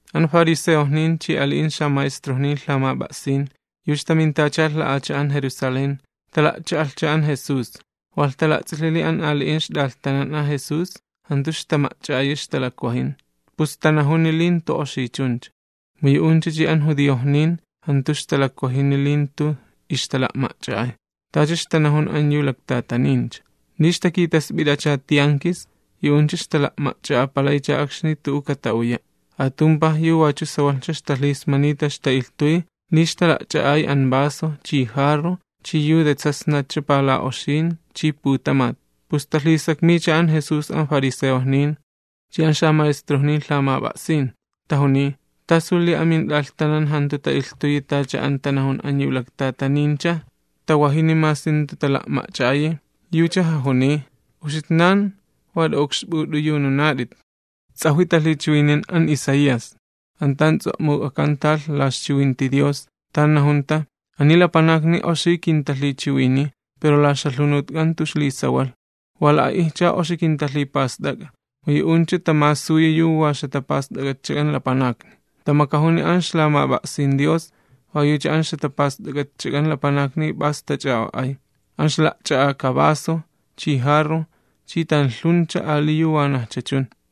An fariseojnin chi ali'in xamaestrojnin lhamap'a'sin, yu ixtamintachalh la'acha'an Jerusalén, tala'cha'alhcha an Jesús. Walh tala'ts'ilhi li an ali'in ixt'alhtanan an Jesús jantu ixtama'ch'a'ayi ixtalakwajin, pus yu'uncha tanajun li jantu oxi chuncha. (Mu yu'uncha chi an judiojnin jantu ixtawajini li jantu ixtala'ma'ch'a'ay, tacha ixtanajun an laktatanin. Li ixtakitasp'it'acha tiankis, yu'uncha ixtala'ma'ch'a'apalaycha akxni tu'u kata'uya'. Atumpaj yu wachu sawalhcha ixtalhismanita ixta'ilhtuy, li ixtala'ch'a'ay an vaso, chi jarro, chi yu de tsasnat pala'oxin chi putamat.) Pus talhisakmiycha an Jesús an fariseojnin chi an xamaestrojnin lhamap'a'sin, tajuniy: ―¿Tasu li amint'alhtanan jantu ta'ilhtuyi tacha an tanajun an laktatanincha? ¿Tawajini masi jantu tala'ma'ch'a'ayi? Yucha jajuniy: ―¡Uxitnan wa layat'itcha! Ts'ajwi talhichiwinin an Isaías, an tan ts'o'muk'akanta la ixchiwinti Dios, tan najunta: Ani lapanakni oxi kintalhichiwiniy, pero la ixjalhunutk'an jantu ixlisawalh. Wa la'a'ijcha oxi kintalhipast'ak'a, mu yu'uncha tamasuyi yu wa ixjatapast'ak'atchak'an lapanakni. Tamakajuni an ixlamap'a'sin Dios, wa yucha an ixjatapast'ak'atchak'an lapanakni p'as tach'a'o'ay: [an ixla'ch'a'aka vaso, chi jarro, chi tanlhuncha ali yu wanajcha chun.]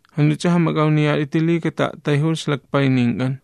Jant'uch'a jamak'awniyat'iti li kata'a'tayjulh ixlakpaynink'an.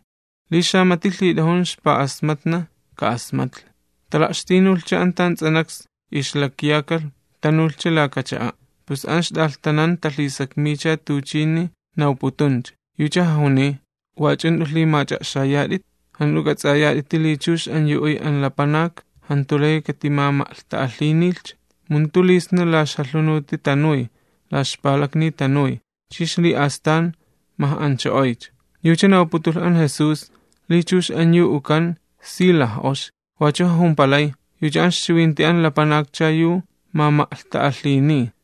Li xamati lhit'ajun ixpa'asmatna, ka'asmatlhi.] Tala'xtinulhcha an tan ts'anaks ixlakyakalh tanulhcha laka cha'a', pus an ixt'alhtanan talhisakmiycha tuchini nawputuncha. Yucha jajuniy: ―¿Wach'u jant'u lhimach'a'xayat'it? ¿Jant'u k'ats'ayat'iti li chux an yu uy an lapanak jantu layi katimama'lhta'alhinilhcha? Mu jantu li sna la ixjalhunuti tanuy, la ixpalakni tanuy, chi ixli'astan maj'ancho'oycha. Yucha nawputulh an Jesús li chux an yu ukan si laj'oxi. Wachu jajumpalay: ―Yucha an ixchiwinti an lapanakcha yu mama'lhta'alhiniy.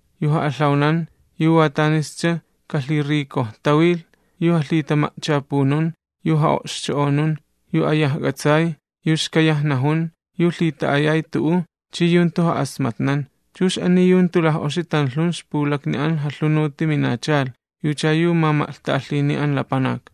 yu ja'alhawanan, yu sawalhcha a'sputni, yu jalhitama'chapunun, yu ja'o'xcho'onun, yu ayajk'atsay, yu xkayaj najun, yu lhita'ayay tu'u, chi yu jantu ja'asmatnan. Chux ani yu jantu laj'oxi tanlhun ixpulakni an jalhunuti minachalh, yucha yu mama'lhta'alhiniy an lapanak.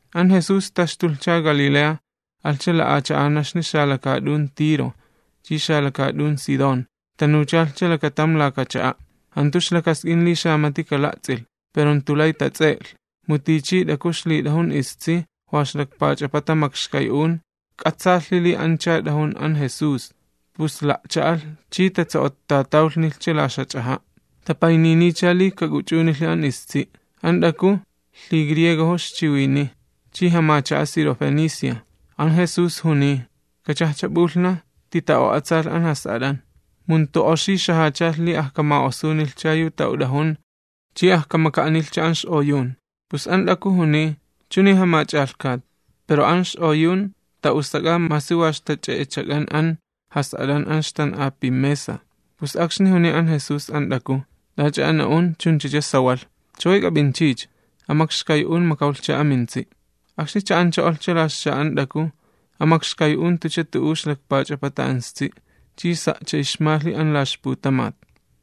An Jesús taxtuchalhcha Galilea alhcha xalakaat'un Tiro chi xalakaat'un Sidón. Tanuchalhcha lakatam laka cha'a'. Jantu ixlakask'in li xamati kala'ts'ilh, pero jantu lay tats'e'lhi. Mu tichi t'aku ixlit'ajun istsi, wa ixlakpach'apata makxkay'un. K'atsaalhi li ancha t'ajun an Jesús, pus la'cha'alh chi tatso'ottatawlhnilhcha la ixjach'aja'. Tapayniniycha li kak'uch'unilhi an istsi'. An t'aku lhigriegojo ixchiwiniy chi jamacha'a Sirofenicia. An Jesús juniy: ―Kachajcha p'ulhnaj tita'o'atsalh an jas'at'an, mu jantu oxi xajachalh li ajkama'osunilhcha yu ta'ut'ajun chi ajkamaka'anilhcha an x'oyun. Pus an t'aku juniy: ―Chuni, Jamach'alhkat, pero an x'oyun ta'usak'a masi wa ixtach'e'echak'an an jas'at'an an ixtan'api mesa. Pus akxni juniy an Jesús an t'aku: ―T'ach'a an na'un chunchacha sawalh, chaway k'ap'inch'icha, an makxkay'un makawlhcha amintsi'. Akxni cha'ancho'olhcha la ixcha'a an t'aku, an makxkay'un jantucha tu'u ixlakpach'apata an istsi', chi sa'cha ixmalhi an la ixputamat.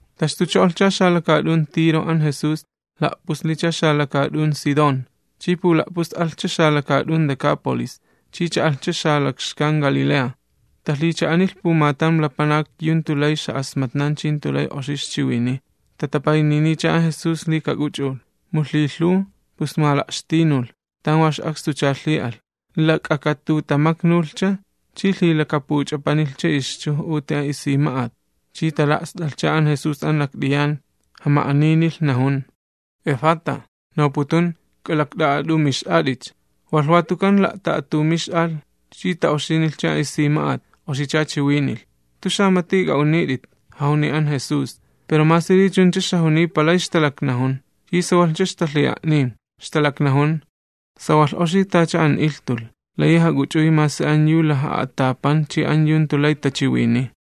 Taxtucho'ochalhcha xalakaat'un Tiro an Jesús, la'puslicha xalakaat'un Sidón, chi pula'pus'alhcha xalakaat'un Decápolis, chi cha'alhcha la xalakxkan Galilea. Talhicha'anilh pumatam lapanak yu jantu lay ixja'asmatnan chi jantu lay oxi ixchiwiniy. Tatapayniniycha an Jesús li kak'uch'ulh. Mu lhilhuw, pus mala'xtinulh, tan wa ix'akstucha lhi'alh, lak'akatutamaknulhcha chi lhilakapuch'apanilhcha ixchuj'uti an isima'at. Chi tala'st'alhcha an Jesús an lakt'iyan, jama'aninilh, najun: ―¡Efata! ―nawputun: ¡K'alakt'a'a'at'umix'at'icha! Walh watukan la'ta'a'atumix'alh chi ta'oxinilhcha an isima'at, oxicha chiwinilh. ―Jant'u xamat'i k'a'unit'it ―jajuniy an Jesús. Pero masi li chuncha ixjajuniy palay ixtalaknajun. Chi sawalhcha ixtalhi'a'niy, ixtalaknajun: ―Sawalh oxi tacha an ilhtulh, layi jak'uch'uy masi an yu wa laj'a'atapan chi an yu jantu lay tachiwiniy.